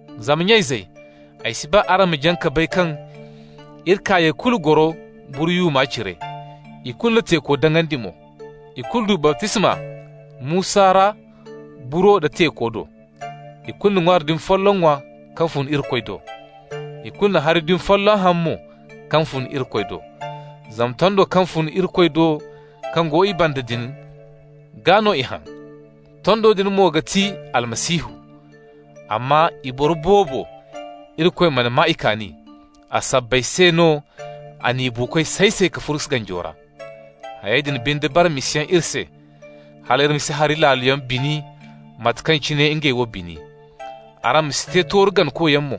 Zama nya-izey, ay si ba araŋ ma jaŋ ka bay kaŋ iri kaayey kulu goro buru yuuma cire, ikulu na teeko daŋandi mo. Ikulu du baptisma Musa ra buro da teeko do. Ikulu na ŋwaari dumi folloŋ ŋwa kaŋ fun Irikoy do. Ikulu na hari dumi folloŋ haŋ mo kaŋ fun Irikoy do. Zama tondo kaŋ fun Irikoy do kaŋ go i banda din gaa no i haŋ. Tondo din mo ga ti Almasihu. Amma i boro boobo, Irikoy mana maa i kaani. A sabbay se no a n'i buukoy say-say ka furu ganjo ra. Hayey din binde bara misayaŋ iri se, hal iri ma si hari laaloyaŋ bini, mate kaŋ cine ngey wo bini. Araŋ ma si te tooru ganakoyaŋ mo,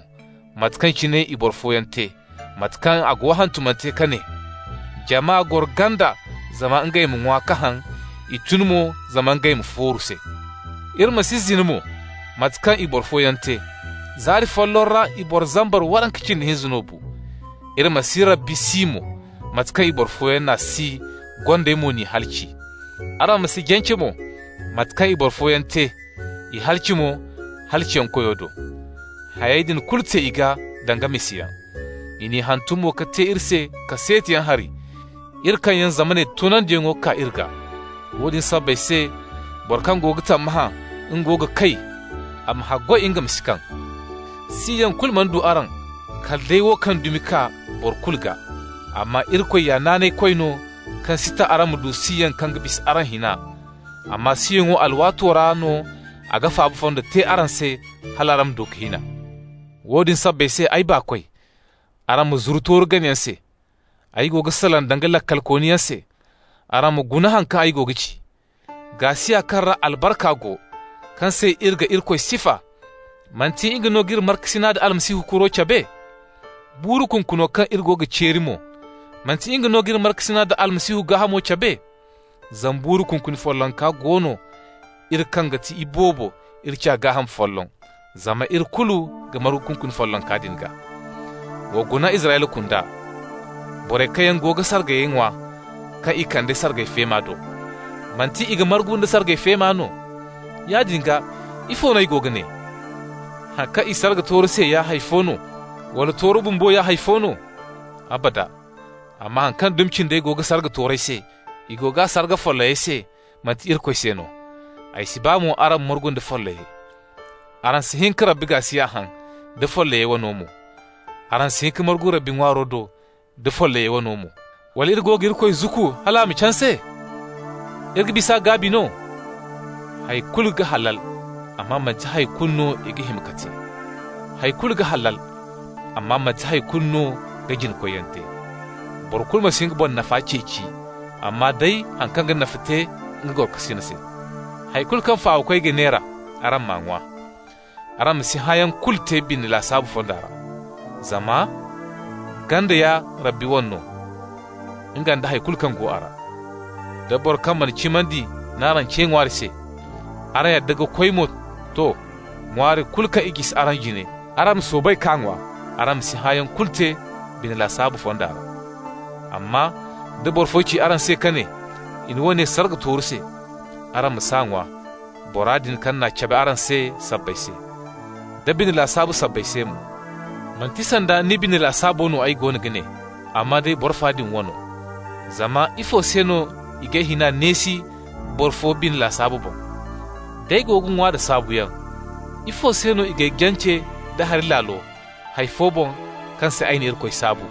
mate kaŋ cine i boro fooyaŋ te, mate kaŋ a go hantumante ka ne: «Jama goro ganda zama ngey ma ŋwa ka haŋ, i tun mo zama ngey ma fooru se.» Iri ma si zina mo, mate kaŋ i boro fooyaŋ te. Zaari folloŋ ra i boro zambar waranka cindi hinza no bu. Iri ma si Rabbi si mo, mate kaŋ i boro fooyaŋ n'a si, gondey mo n'i halaci. Araŋ ma si jance mo, mate kaŋ i boro fooyaŋ te, i halaci mo halaciyankoyo do. Hayey din kulu te i gaa danga misayaŋ. I n'i hantum mo ka te iri se kaseetiyaŋ hari, iri kaŋ yaŋ zamaney toonandiyaŋ kaa iri gaa. Woodin sabbay se, boro kaŋ go ga tammahã nga go ga kay, a ma haggoy nga ma si kaŋ. Siyaŋ kulu mana du araŋ kala day wo kaŋ dumi ga kaa boro kulu gaa. Amma Irikoy ya naanaykoy no kaŋ si ta araŋ ma du siyaŋ kaŋ ga bisa araŋ hina, amma siyaŋo alwaato ra no a ga faaba fondo te araŋ se hal araŋ ma du ka hin a. Woodin sabbay se, ay baakoy, araŋ ma zuru tooru ganayaŋ se. Ay go ga salaŋ danga laakalkooniyaŋ se, araŋ ma guna haŋ kaŋ ay go ga ci. Gaasiya kaŋ ra albarka go, kaŋ se iri ga Irikoy sifa, manti nga no g'iri markasina da Almasihu kuro cabe? Buuru kunkuno kaŋ iri ga ceeri mo, manti nga no g'iri markasina da Almasihu gaahamo cabe? Zama buuru kunkuni follonka go no, iri kaŋ ga ti iboobo, iri ciya gaaham folloŋ, zama iri kulu ga margu kunkuni follonka din gaa. Wa guna Israyla kunda. Borey kaŋ yaŋ go ga sargayey ŋwa kaŋ i kande sargay feema do, manti i ga margu nda sargay feema no? Yaadin gaa, ifo no ay go ga ne? Haŋ kaŋ i sarga tooru se ya hay fo no, wala tooru bumbo ya hay fo no? Abada! Amma haŋ kaŋ dumi cindey go ga sarga toorey se, i go g'a sarga follayey se, manti Irikoy se no. Ay si ba mo araŋ ma margu nda follayey. Araŋ si hin ka Rabbi gaasiya haŋ, da follayey wano mo. Araŋ si hin ka margu Rabbi ŋwaaro do, da follayey wano mo. Wala iri go ga Irikoy zukku hal a ma canse? Iri ga bis'a gaabi no? Hay kulu ga halal, amma manti hay kulu no i ga hima ka te. Hay kulu ga halal, amma manti hay kulu no ga jina-koyyaŋ te. Boro kulu ma si nga boŋ nafa ceeci, amma day haŋ kaŋ ga nafa te nga gorokasin se. Hay kulu kaŋ fawakoy ga neera, araŋ m'a ŋwa. Araŋ ma si hãayaŋ kulu te bine lasaabu fonda ra. Zama «Ganda ya Rabbi wane no, nga nda hay kulu kaŋ go a ra.» Da boro kaŋ mana cimandi n'araŋ ce ŋwaari se, araŋ yadda ka koy mo, to, ŋwaari kulu kaŋ i ga jisi araŋ jine, araŋ ma soobay k'a ŋwa. Araŋ ma si hãayaŋ kulu te bine lasaabu fonda ra. Amma da boro fo ci araŋ se ka ne: «I na woone sarga tooru se», araŋ ma s'a ŋwa, bora din kaŋ n'a cabe araŋ se sabbay se, da bine lasaabu sabbay se mo. Manti sanda ni bine lasaabo no ay go ga ne, amma day boro fa din wano. Zama ifo se no i g'ay hina neesi boro fo bine lasaabo boŋ? D'ay go ga ŋwa da saabuyaŋ, ifo se no i g'ay jance nda hari laalo, hay fo boŋ kaŋ se ay na Irikoy saabu?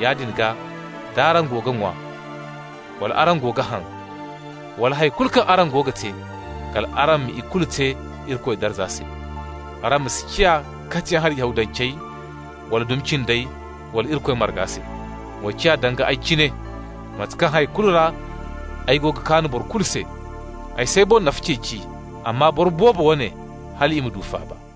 Yaadin gaa, d'araŋ go ga ŋwa, wala araŋ go ga haŋ, wala hay kulu kaŋ araŋ go ga te, kal araŋ ma ikulu te Irikoy darza se. Araŋ ma si ciya katiyaŋ hari Yahudancey, wala dumi cindey, wala Irikoy marga se. Wa ciya danga ay cine, mate kaŋ hay kulu ra ay go ga kaan boro kulu se. Ay s'ay boŋ nafa ceeci, amma boro boobo wane, hal i ma du faaba.